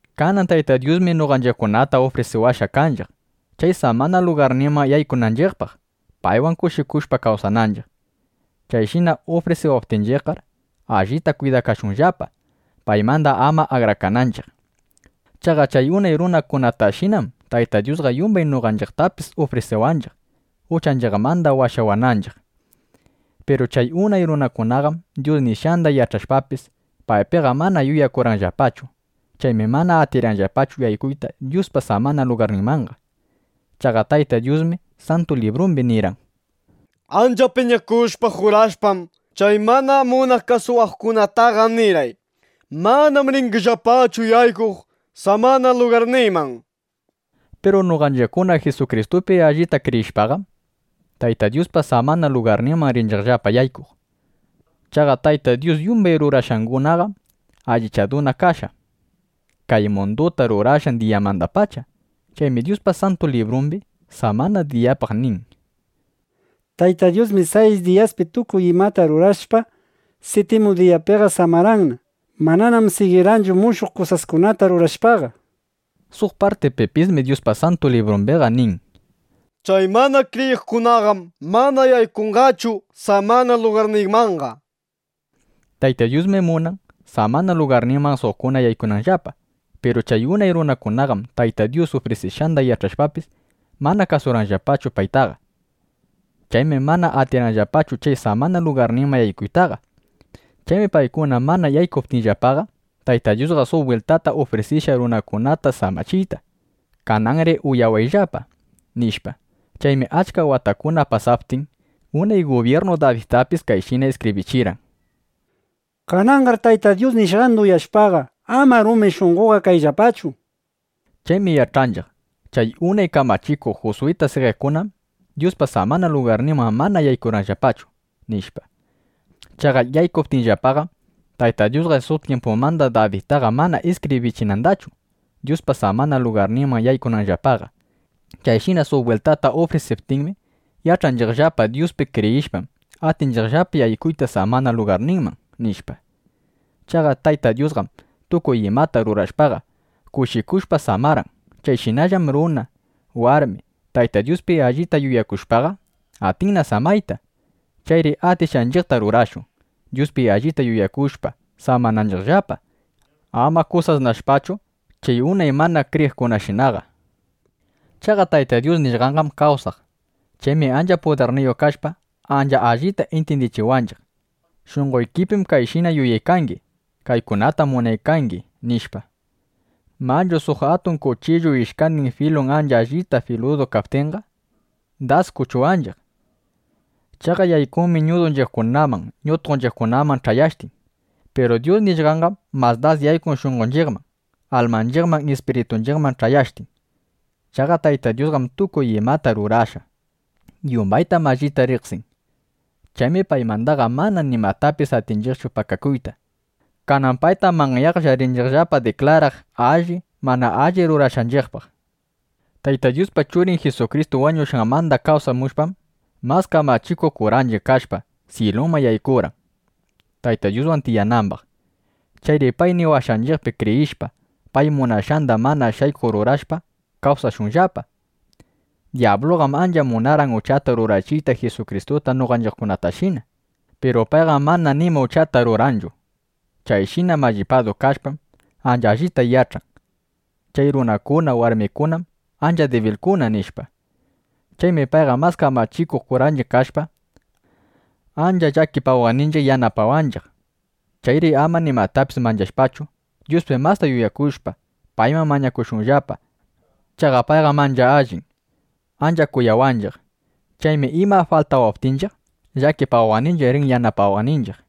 Kanan Tayta Dyusmi noqanchiqkunata ufrisiwashqa kanchiq, chay samana lugarninman yaykunanchiqpaq, paywan kushikushpa kawsananchiq. Chayshina ufrisiwaptinchiqqar, allita kwidakashunllapa, paymanda ama akrakananchiq. Chaqa chay unay runakunatashinam Tayta Dyusqa yumbay noqanchiqtapis ufrisiwanchiq, uchanchiqmanda washawananchiq. Piru chay unay runakunaqam Dyus nishqanda yach'ashpapis, paypiqa mana yuyakurqanllapachu. Chaymi mana atirqanllapachu yaykuyta Dyuspa samana lugarninmanqa. Chaqa Tayta Dyusmi Santu Librumbi nirqan: Ancha piñakushpa, jurashpam, chay mana munaq kasuwaqkunataqa nirqay: “Manam ringillapachu yaykuq samana lugarniyman”, nishpa. Piru noqanchiqkuna Jisukristupi allipta kriyishpaqam, Tayta Dyuspa samana lugarninman rinchiqllapa yaykuq. Chaqa Tayta Dyus yumbay rurashqangunaqam allichaduna kashqa, kay munduta rurashqan diyamandapacha. Chaymi Dyuspa Santu Librumbi samana diyapaq nin: Tayta Dyusmi sayis diyaspi tukuy imata rurashpa, siptimu diyapiqa samarqanna. (Mananam sigirqanchu mushuq kusaskunata rurashpaqa), nishpa. Suq partipipismi Dyuspa Santu Librumbiqa nin: Chay mana kriyiqkunaqam mana yaykunqachu samana lugarniymanqa, nishpa. Tayta Dyusmi munan, samana lugarninman suqkuna yaykunanllapa. Piru chay unay runakunaqam Tayta Dyus ufrisishqanda yach'ashpapis, mana kasurqanllapachu paytaqa. Chaymi mana atirqanllapachu chay samana lugarninman yaykuytaqa. Chaymi paykuna mana yaykuptinllapaqa, Tayta Dyusqa suq bwiltata ufrisirishqa runakunata samachiyta: “Kananri uyawayllapa”, nishpa. Chaymi achka watakuna pasaptin, unay gubyirnu Dabidtapis kayshina iskibrichirqan: Kananqar Tayta Dyus nishqanda uyashpa, ama rumi shunqoyuqqa kayllapachu, nishpa. Chaymi yach'anchiq: Chay unay kamachikuq Juswita sigiqkunam Dyuspa samana lugarninman mana yaykurqanllapachu, nishpa. Chaqa yaykuptinllapaqam, Tayta Dyusqa suq tyimpumanda Dabidtaqa mana iskibrichinandachu, Dyuspa samana lugarninman yaykunanllapaqa. Chayshina suq bwiltata ufrisiptinmi, yach'anchiqllapa: Dyuspi kriyishpam, atinchiqllapa yaykuyta samana lugarninman, nishpa. Chaqa Tayta Dyusqam tukuy imata rurashpaqa, kushikushpa samarqan. Chayshinallam runa, warmi, Tayta Dyuspi allita yuyakushpaqa, atinna samayta. Chayri atishqanchiqta rurashun, Dyuspi allita yuyakushpa, samananchiqllapa, ama kusasnashpachu chay unay mana kriyiqkunashinaqa. Chaqa Tayta Dyus nishqanqam kawsaq. Chaymi ancha pudirniyuq kashpa, ancha allita intyindichiwanchiq: Shunqoykipim kayshina yuyaykangi; kaykunatam munaykangi, nishpa. Manchu suq atun kuchillu ishkandin filun ancha allita filudu kaptinqa, das kuchuwanchiq. Chaqa yaykunmi ñudunchiqkunaman, ñutqonchiqkunaman ch'ayashtin. Piru Dyus nishqanqam mas das yaykun shunqonchiqman, almanchiqman, ispiritunchiqman ch'ayashtin. Chaqa Tayta Dyusqam tukuy imata rurashqa. Yumbaytam allita riqsin. Chaymi paymandaqa mana nimatapis atinchiqchu pakakuyta. Kanan paytam manyaqlla rinchiqllapa diklaraq alli, mana alli rurashqanchiqpaq. Tayta Dyuspa Churin Jisukristu wañushqanmanda kawsamushpam, mas kamachikuq kuranchiq kashpa, syiluman yaykurqan, Tayta Dyuswan tiyanambaq. Chayri pay niwashqanchiqpi kriyishpa, pay munashqanda mana shaykuq rurashpa, kawsashunllapa. Dyabluqam ancha munarqan uchata rurachiyta Jisukristuta noqanchiqtashina. Piru payqam mana nima uchata rurarqanchu. Chayshina mallipadu kashpam, ancha allita yach'an: Chay runakuna, warmikunam ancha dibilkuna, nishpa. Chaymi payqa, mas kamachikuq kuranchiq kashpa, ancha llakipawaqninchiq yanapawanchiq. Chayri ama nimatapis manchashpachu, Dyuspi masta yuyakushpa, payman mañakushunllapa. Chaqa payqam ancha allin. Ancha kuyawanchiq. Chaymi ima faltawaptinchiq, llakipawaqninchiq rin yanapawaqninchiq.